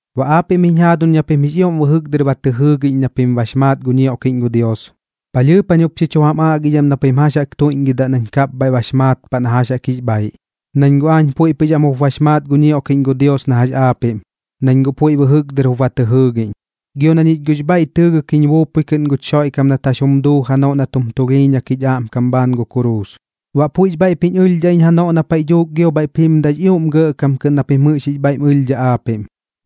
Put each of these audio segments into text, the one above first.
Baꞌ aapiꞌm jiñ jaaduñ na pim jix ioꞌm bɨjɨk dɨr ba tɨ jɨɨgiꞌñ na pim bax maat gu ñioꞌkiꞌñ gu Dios, palhɨɨp jañ jup xi chu jam aꞌgidham na pim jax jaꞌk tuiꞌñgɨdaꞌ nañ kapbhaiꞌ bax maat paꞌ na jax jaꞌk jix bhaiꞌ. Nañ guꞌ aañ puiꞌ pɨx am jup bax maat gu ñioꞌkiꞌñ gu Dios na jax aapiꞌm, nañ guꞌ puiꞌ bɨjɨk dɨr jup ba tɨ jɨɨgiꞌñ, gio na ñich guꞌx bhaiꞌ tɨɨgɨk jiñ buupui kɨꞌn guch Xoiꞌkam nat jax jum duu janoꞌ nat jum tulhiiñak jich aꞌmkam bhaan gu kuruus. Baꞌ puiꞌx bhaiꞌp jiñ ɨlhdhaꞌ iñ janoꞌ na paiꞌ dhuuk gio bhaiꞌp jimdaꞌx ioꞌm gɇꞌkam kɨꞌn na pim jax jix bhaiꞌm ɨlhdhaꞌ aapiꞌm,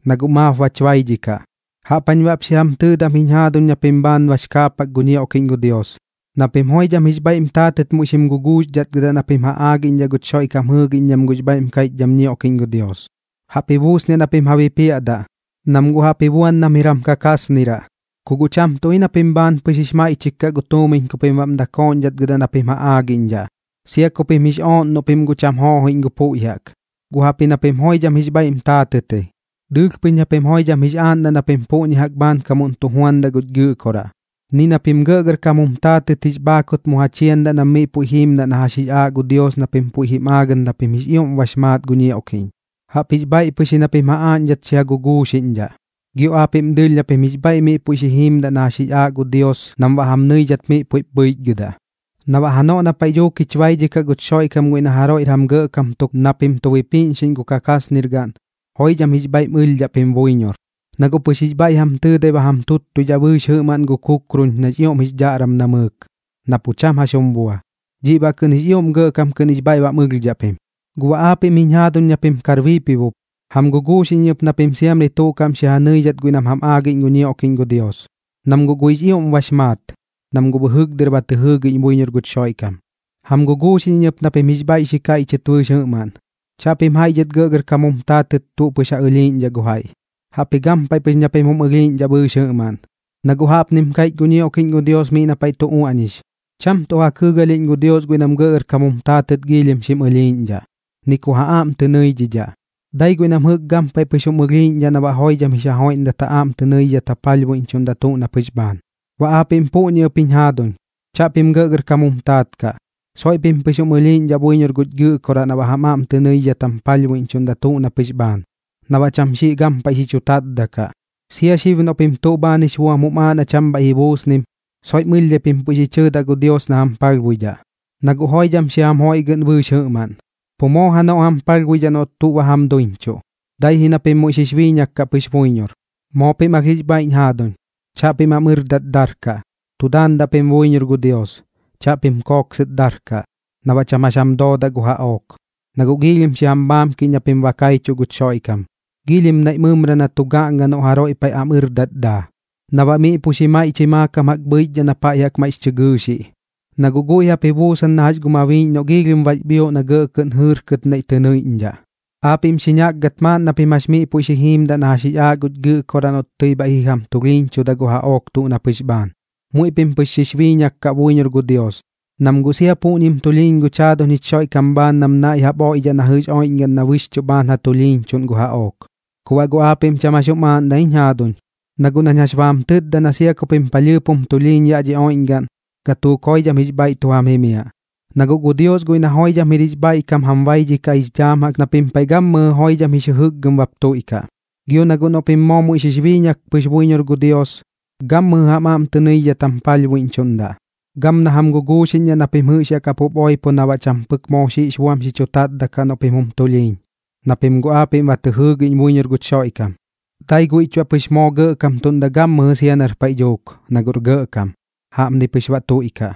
na guꞌ maap bach baidhikaꞌ. Jaꞌp jañ baꞌp xi jam tɨɨdam jiñ jaaduñ na pim bhaan bax kaapak gu ñioꞌkiꞌñ gu Dios, na pim joidham jix bhaiꞌm taatɨt muiꞌ xim guguuxdhatgɨdaꞌ na pim ja aagiꞌñdhaꞌ guch Xoiꞌkam jɨɨgiꞌñdham gux bhaiꞌm kaiꞌchdham ñioꞌkiꞌñ gu Dios. Jaꞌp ji buusniaꞌ na pim ja bipiaꞌdaꞌ, nam guꞌ jaꞌp ji buan nam jir jam kakaasniraꞌ. Ku guꞌ cham tuꞌ ji na pim bhaan pɨx jix maiꞌchik kaꞌ gu tuumiñ ku pim baꞌm dakooꞌñdhatgɨdaꞌ na pim ja aagiꞌñdhaꞌ, sia ku pim jix ooꞌn noꞌ pim guꞌ cham joojoiꞌñ gu puiꞌ jaꞌk. Guꞌ jaꞌpji na pim joidham jix bhaiꞌm taatɨt ji, dɨɨlh pɨx na pim joidham jix aaꞌndaꞌ na pim puꞌñi jaꞌk bhaankamuꞌn tu juandaꞌ guch Gɨꞌkoraꞌ. Ni na pim gɇꞌgɇrkam jum taatɨt jix bhaakut mu ja chiandaꞌ nam miꞌ puiꞌ jimiaꞌ na jax jix aaꞌ gu Dios na pim puiꞌ jim aagɨt na pim jix ioꞌm bax maat gu ñioꞌkiꞌñ. Jaꞌpjix bhaiꞌ pɨx ji na pim ja aaꞌñdhat xi ja guguuxiꞌñdhaꞌ, gio aapiꞌm dɨɨlh na pim jix bhaiꞌ miꞌ puiꞌ xi jiimdaꞌ na jax jix aaꞌ gu Dios nam baꞌ jam nɨidhat miꞌ puiꞌp bhɨichgɨdaꞌ. Na baꞌ janoꞌ na paiꞌ dhuuk jich baidhikaꞌ guch Xoiꞌkam guiꞌ na jaroiꞌr jam gɇꞌkam tuk na pim tu bipiꞌñxiꞌñ gu kakaasnir gaꞌn, joidham jix bhaiꞌm ɨlhdhaꞌ pim buiñor, na guꞌ pɨx jix bhaiꞌ jam tɨɨdai ba jam tuttuidhaꞌ bɨɨx jɨꞌmaꞌn gu kuruun nax ioꞌm jix dhaꞌram namɨɨk, na pu cham jax jum bua, dhiꞌ baꞌ kɨꞌn jix ioꞌm gɇꞌkam kɨꞌn jix bhaiꞌ bam ɨlhdhaꞌ pim. Guꞌ baꞌ aapiꞌm jiñ jaaduñ na pim kar biipibop, jam guguuxiꞌñ iñ ɨp na pim siamri tuꞌ kaꞌm xi ja nɨidhat guiꞌ nam jam aagiꞌñ gu ñioꞌkiꞌñ gu Dios, nam guꞌ guiꞌx ioꞌm bax maat, nam guꞌ bɨjɨk dɨr ba tɨ jɨɨgiꞌñ buiñor guch Xoiꞌkam. Jam guguuxiꞌñ iñ ɨp na pim jix bhaiꞌ xi kaiꞌchɨt bɨɨx jɨꞌmaꞌn, chaꞌpim jaiꞌ dhɨt gɇꞌgɇrkam jum taatɨt tuꞌ pɨx ja ɨlhiiꞌñdhaꞌ gu jaiꞌ. Jaꞌpji gampaiꞌ pɨx na pim jum ɨlhiiꞌñdhaꞌ bɨɨx jɨꞌmaꞌn, na guꞌ jaꞌpnim kaiꞌch gu ñioꞌkiꞌñ gu Dios miꞌ na paiꞌ tu uaꞌñix: Cham tuꞌ ja kɨɨgalhiꞌñ gu Dios guiꞌ nam gɇꞌgɇrkam jum taatɨt giilhim xim ɨlhiiꞌñdhaꞌ, ni ku ja aꞌm tɨ nɨiꞌñdhaꞌ, dai guiꞌ nam jɨꞌk gampaiꞌ pɨx jum ɨlhiiꞌñdhaꞌ na baꞌ joidham jix ja joiꞌndat ja aꞌm tɨ nɨidhidhat ja palhbuiꞌñchuꞌndaꞌ tuꞌ na pɨx bhaan. Baꞌ aapiꞌm puꞌñi ɨp jiñ jaaduñ, chaꞌpim gɇꞌgɇrkam jum taat kaꞌ, soiꞌ pim pɨx jum ɨlhiiꞌñdhaꞌ buiñor guch Gɨꞌkoraꞌ na baꞌ jam aꞌm tɨ nɨidhidhat jam palhbuiꞌñchuꞌndaꞌ tuꞌ na pɨx bhaan, na baꞌ cham xiꞌ gampaiꞌ xi chu tatdaꞌ kaꞌ. Sia xib noꞌ pim tuꞌ bhaan jix buam jum aaꞌ na cham bhaiꞌ ji buusnim, soiꞌm ɨlhdhai pim puiꞌ xi chɨɨdaꞌ gu Dios na jam palhbuidhaꞌ. Na guꞌ guiꞌ joidham xi jam joiꞌgɨꞌn bɨɨx jɨꞌmaꞌn, pu moo janoꞌ jam palhbuidhaꞌ noꞌ tuꞌ ba jam duiñchuꞌ, dai ji na pim muiꞌ xix biiñak kaꞌ pɨx buiñor. Moo pim alh jix bhaiꞌñ jaaduñ, chaꞌpim am ɨrdat darkaꞌ. Tu daandaꞌ pim buiñor gu Dios, chaꞌpim kooksɨt darkaꞌ, na baꞌ cham jax jam doodaꞌ gu jaꞌook. Na guꞌ giilhim xi jam bhaamkiꞌñ na pim ba kaichuꞌ guch Xoiꞌkam, giilhim naiꞌ mɨmra na tu gaꞌnga noꞌ jaroiꞌ paiꞌ am ɨrdat daa, na baꞌ miꞌ pu xi maiꞌchɨi maakam jaꞌk bhɨichdhaꞌ na paiꞌ jaꞌk maiꞌx chɨ gɨɨxiꞌ. Na guꞌ guiꞌ jaꞌp ji buusan na jax gu mabiiꞌñ noꞌ giilhim bax bhioꞌ na gɇꞌ kɨꞌn jɨɨrkɨt naiꞌ tɨ nɨiꞌñdhaꞌ. Aapiꞌm xi ñakgat maaꞌn na pim jax miꞌ puiꞌ xi jiimdaꞌ na jax jix aaꞌ guch Gɨꞌkoraꞌ noꞌt tɨi bhaiꞌ ji jam tulhiiñchuda gu jaꞌook tuꞌ na pɨx bhaan. Muiꞌ pim pɨx xix biiñak kaꞌ buiñor gu Dios, nam guꞌ sia puꞌñim tulhiiñ guch jaaduñ jich Xoiꞌkam bhaan nam naiꞌ jaꞌp oiꞌdhaꞌ na jɨꞌx oiꞌñgaꞌn na bɨxchuꞌ bhaan ja tulhiiñchuꞌn gu jaꞌook. Ku baꞌ guꞌ aapiꞌm cham jax jum aaꞌndaꞌ ji jiñ jaaduñ, na guꞌ nañ jax ba jam tɨtda na sia ku pim palhɨɨp jum tulhiiñ yaꞌ dhi oiꞌñgaꞌn, gatuuk joidham jix bhaiꞌ tu jam jimiaꞌ. Na guꞌ gu Dios guiꞌ na joidham jir jix bhaiꞌkam jam baidhikaꞌ jix dhaam jaꞌk na pim paiꞌ gammɨjɨ joidham jix jɨkgɨm bap tuiꞌkaꞌ. Gio na guꞌ noꞌ pim moo muiꞌ xix biiñak pɨx buiñor gu Dios, gammɨjɨ jam aꞌm tɨ nɨidhidhat jam palhbuiꞌñchuꞌndaꞌ, gam na jam guguuxiꞌñdhaꞌ na pim jɨꞌx yaꞌ kapup oipo na baꞌ cham pɨk moo xiꞌx buam xi chu tatdaꞌ kaꞌ noꞌ pim jum tulhiiñ, na pim guꞌ aapiꞌm ba tɨ jɨɨgiꞌñ buiñor guch Xoiꞌkam. Dai guiꞌch baꞌ pɨx moo gɇꞌkamtuꞌndaꞌ gammɨjɨ sia nar paiꞌ dhuuk, na guꞌr gɇꞌkam. Jaꞌpni baꞌ pɨx tuiꞌkaꞌ.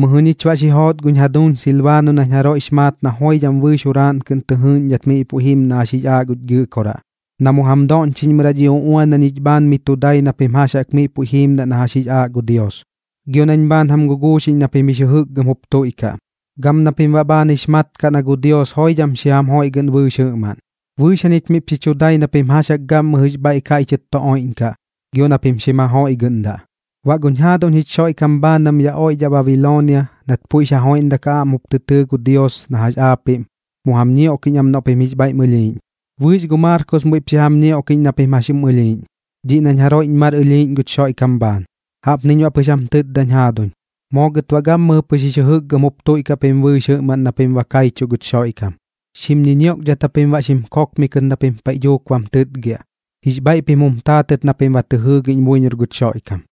Mɨjɨ ñich baꞌ xi joot guñ jaduuñ Silbaano nañ jaroiꞌx maat na joidham bɨɨx juraaꞌn kɨꞌn tɨ jɨɨꞌñdhat miꞌ puiꞌ jim na jax jix aaꞌ guch Gɨꞌkoraꞌ, na mu jam doꞌñchiꞌñmɨraꞌ dhi uꞌuan na ñich bhaan miꞌ tu dai na pim jax jaꞌk miꞌ puiꞌ jiimdaꞌ na jax jix aaꞌ gu Dios, gio nañ bhaan jam guguuxiꞌñ na pim jix jɨjɨkgɨm jup tuiꞌkaꞌ, gam na pim baꞌ bhaan jix mat kaꞌ na gu Dios joidham xi jam joiꞌgɨꞌn bɨɨx jɨꞌmaꞌn. Bɨɨx jañich miꞌp xi chu dai na pim jax jaꞌk gammɨjɨx bhaiꞌ kaiꞌchɨt tu oiꞌñkaꞌ, gio na pim xim ja joiꞌgɨꞌndaꞌ. Baꞌ guñ jaaduñ jich Xoiꞌkam bhaan nam yaꞌ oiꞌdhaꞌ Babiloonia, nat puiꞌx ja joiꞌndak ja aꞌm jup tɨ tɨɨ gu Dios na jax aapiꞌm, mu jam ñioꞌkiꞌñ am noꞌ pim jix bhaiꞌm ɨlhiiꞌñ. Bɨɨx gu Maarkos muiꞌp xi jam ñioꞌkiꞌñ na pim jax jum ɨlhiiꞌñ, dhiꞌ nañ jaroiꞌñ mar ɨlhiiꞌñ guch Xoiꞌkam bhaan. Jaꞌpniñ baꞌ pɨx jam tɨtdañ jaaduñ. Moo gɨt baꞌ gammɨjɨ pɨx jix jɨjɨkgɨm jup tuiꞌkaꞌ pim bɨɨx jɨꞌmaꞌn na pim ba kaichuꞌ guch Xoiꞌkam. Xim ñiñioꞌkdhat japim baꞌ xim kookmikɨk na pim paiꞌ dhuuk bam tɨtgiaꞌ, jix bhaiꞌ pim jum taatɨt na pim ba tɨ jɨɨgiꞌñ buiñor guch Xoiꞌkam.